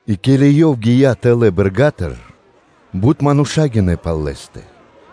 И ке́ли Ёв гия́ тэлэ́ бэрга́тыр, бут мануша́ гинэ́ пал Лэ́стэ.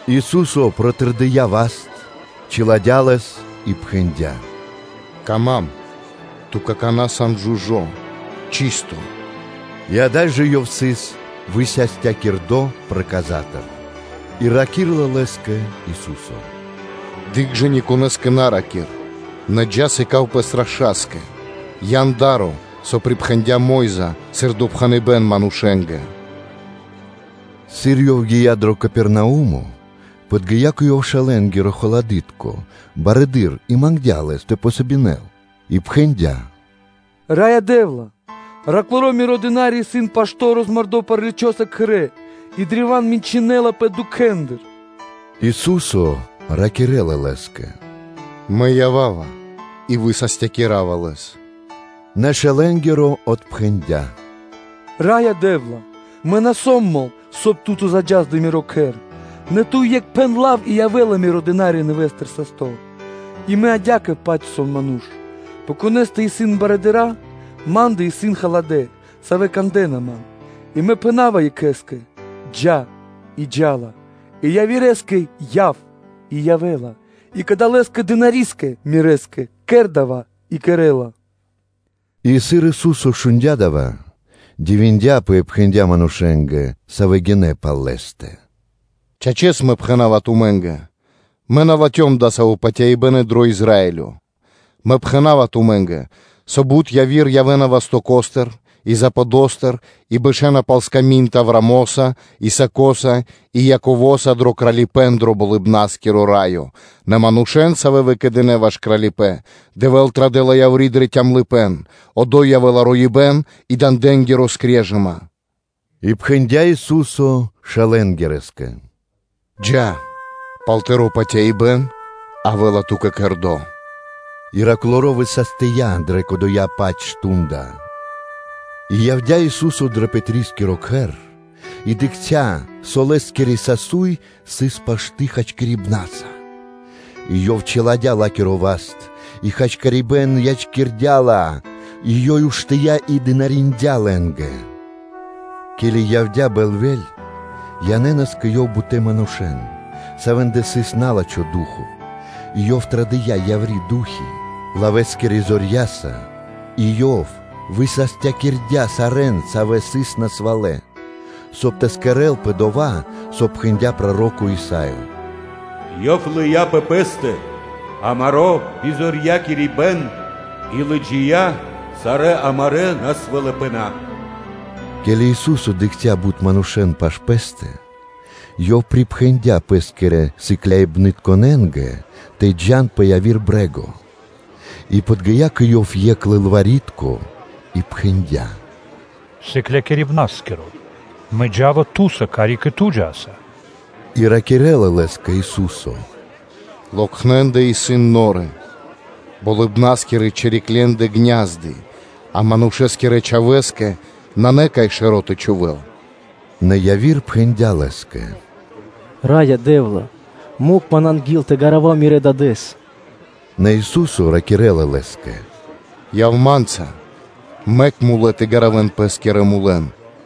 Ису́со протырдыя́ васт, чиладя́ (чыпиндя) лэс и пхэндя́: “Пир ило́ исын, ту какана́ сан жужо́ (чысто).” И ада́й жэ ёв сыс высастякирдо проказатыр. И раки́рла лэ́скэ Ису́со: “Дыкх жэ; ни конэ́скэ на ра́кир, нэ джа́, сыка́в пэс раша́скэ, ян да́ро, со припхэндя́ Мо́йза, сыр допхэныбэ́н манушэ́нгэ.” Сыр Ёв гия́ дро Капернаумо, подги́я кэ Ёв шэлэнгирэ-халадытко барыдыро́ и мангдя́ Лэс тэ помогинэл, и пхэндя́: “Раё Дэ́вла миро дына́ри (слуга), исын пашто́ розмардо праличоса кхэрэ́ и древа́н мэньчынэлапэ дукхэндыр.” Ису́со ракирэ́ла лэ́скэ: “Мэ ява́ва и высастякирава лэс.” Нэ шэлэнгиро отпхэндя́: “Раё Дэ́вла, мэ на сом мол, соб (кай) Ту тэ заджас дро миро кхэр, нэ Ту екх пхэн лав и явэ́ла миро дына́ри нэвэ́стыр састо́. И мэ адя́кэ-паць сом ману́ш, пэ конэ́стэ исын барыдыра́, ма́ндэ исын халадэ́, савэ́ кандэ́на ман, и мэ пхэна́ва екхэ́скэ: ‘Джа́’, и джа́ла; и явирэскэ: ‘Яв’, и явэ́ла, и кадалэскэ дынари́скэ мирэ́скэ: ‘Кэр дава́’, и кэрэ́ла.” И сыр Ису́со шундя́ дава́, дивиндяпэ и пхэндя́ манушэ́нгэ, савэ́ гинэ́ пал Лэ́стэ: “Чачэс, Мэ пхэна́ва тумэ́нгэ: Мэ на латхём дасаво патяибэ́н и дро Израилё. Мэ пхэна́ва тумэ́нгэ, со бут яви́р явэ́на вастоко́стыр и западостыр (пал-панендыр) и бэшэна пал сками́нд Авраамоса, Исакоса и Яковоса дро Кралипэ́н дро Болыбна́скиро Раё, нэ манушэ́н, савэ́н выкэдынэ́ ваш Кралипэ́н, Дэвэ́л традэ́ла яври́ дрэ калыпэ́н; одо́й явэ́ла роибэ́н и дандэнгири скрежыма” И пхэндя́ Ису́со шэлэнгирэскэ: “Джа́, пал тыро́ патяибэ́н явэ́ла ту́кэ кэрдо́” И дына́ри высастия дрэ кодова́-паць мардо́ (шту́нда). И явдя́ Ису́со дро Пэтрискиро кхэр, и дыкхця́, со лэ́скири сасуй сыс пашты хачкирибнаса: и Ёв чиладя́ ла́киро васт, и хачкирибэ́н ячкирдя́ ла, и ёй уштыя́ и дынариндя́ лэ́нгэ. Ке́ли явдя́ бэльвэ́ль, янэ́нас кэ Ёв бутэ́ манушэ́н, савэ́ндэ сыс на́лачхо ду́хо (фа́но), и Ёв традыя́ яври́ ду́хи (фаны) лавэскирэ зорья́са, и Ёв высастякирдя́ сарэ́н, савэ́ сыс насвалэ; соб (кай) тэ кэрэ́лпэ дова́, со пхэндя́ проро́ко Исаё: “Ёв лыя́ пэ Пэ́стэ амаро́ бизорьякирибэн и лыджия́ сарэ́ амарэ́ насвалыпэна.” Ке́ли Ису́со дыкхця́ бут манушэ́н пашы́л Пэ́стэ, Ёв припхэндя́ Пэ́скирэ сыкляибнытконэ́нгэ тэ джа́н пэ яви́р брэ́го. И подги́я кэ Ёв екх лылвари́тко и пхэндя́: “Сыклякирибна́скиро (Учытелё)! Мэ джа́ва Ту́са, карик и Ту джа́са.” И ракирэ́ла лэ́скэ Ису́со: “Локхнендэ (лисэндэ) исын норы, болыбна́скирэ чириклендэ исын гня́зды (ку́фы), а Манушэ́скирэ Чхавэ́скэ нанэ кай шэро́ тэ чхувэ́л.” Нэ яви́р пхэндя́ Лэ́скэ: “Раё Дэ́вла, мэк ман анги́л тэ гаравав мирэ́ дадэ́с.” Нэ Ису́со ракирэ́ла лэ́скэ: “Яв Ма́нца; мэк мулэ́ тэ гаравэн пэ́скирэ мулэн.”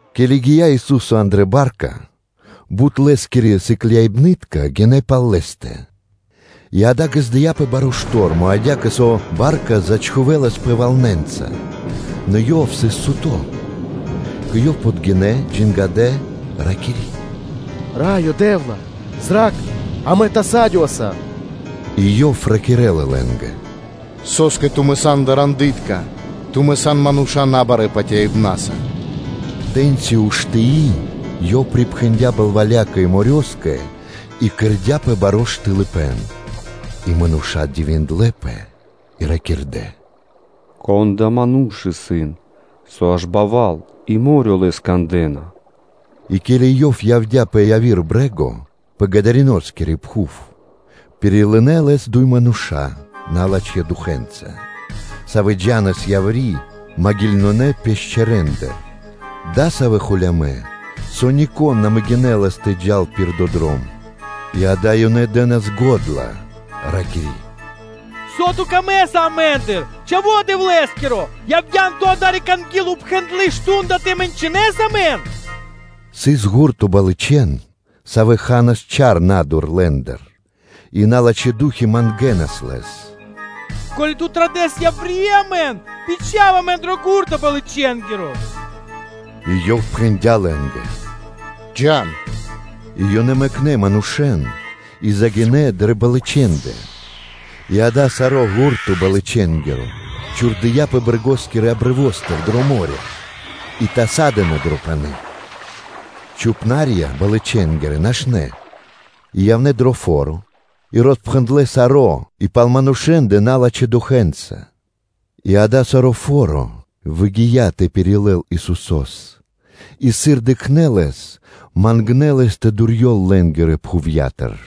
Ке́ли гия́ Ису́со андрэ́ ба́рка, бут Лэ́скирэ сыкляибны́тка гинэ́ пал Лэ́стэ и, акэ, ґаздыя́пэ баро́ штормо адя́кэ, со ба́рка зачхувэласпэ валнэнца; нэ Ёв сыс суто́. Кэ Ёв подгинэ́ сыкляибны́тка, джангадэ Лэс, ракири́: “Раё Дэ́вла, зра́кх, амэ тасадёваса.” И Ёв ракирэ́ла лэ́нгэ: “Со́скэ тумэ́ сан дарандытка, тумэ́ сан мануша́ набарэ́ патяибна́са!” Тэ́ньци уштыи, Ёв припхэндя́ балвалякэ и морёскэ, и кэрдя́пэ баро́ штылыпэн. И мануша́ дивиндлэ́пэ и ракирдэ́: “Кон адава́ Ману́ш исын, со аж балва́л и мо́рё (дэрья́в) Лэс кандэ́на?” И ке́ли Ёв явдя́ пэ яви́р брэ́го пэ Гадариноскири пхув, пирилынэ Лэс дуй мануша́ налачхэ́ духэнца (фанэнца), савэ́ джа́нас яври́ маґилытконэ пешчэрэндыр (ґебарэндыр) дасавэ́ холямэ́, со нико́н на могинэлас тэ джал пир дова́ дром. И, акэ, ёнэ дэ́нас го́дла, ракири́: “Со Ту́кэ трэй амэ́ндыр, Чхаво́ Дэвлэ́скиро? Явдян Ту адари́к анги́л упхэндло́ мардо́ (шту́нда) тэ мэньчынэс амэн?” Сыс ґурто балычэн, савэ́ ханас чар на́дур лэ́ндыр. И налачхэ́ ду́хи (фаны) мангэнас Лэс: “Ко́ли Ту традэсас яври́ амэн, бичха́в амэн дро ґурто балычэнгиро” И Ёв пхэндя́ лэ́нгэ: “Джа́н.” И ёнэ мэкнэ́ манушэ́н и загинэ́ дрэ балычэндэ, и, акэ, саро́ ґурто балычэнгиро чхурдыяпэ брэгоскирэ крутыматыр дро мо́рё (дэрья́в) и ёнэ тасадынэ дро пани́. Чхупна́рья (пасту́хи) балычэнгирэ нашнэ́, и явнэ́ дро фо́ро, и роспхэндлэ́ саро́, и пал манушэ́ндэ налачхэ́ духэнца. И, акэ, саро́ фо́ро выгия́ тэ пирилэл Исусо́с, и, сыр дыкхнэ́ Лэс, мангнэ́ Лэс тэ дурьёл лэ́нгирэ пхувья́тыр.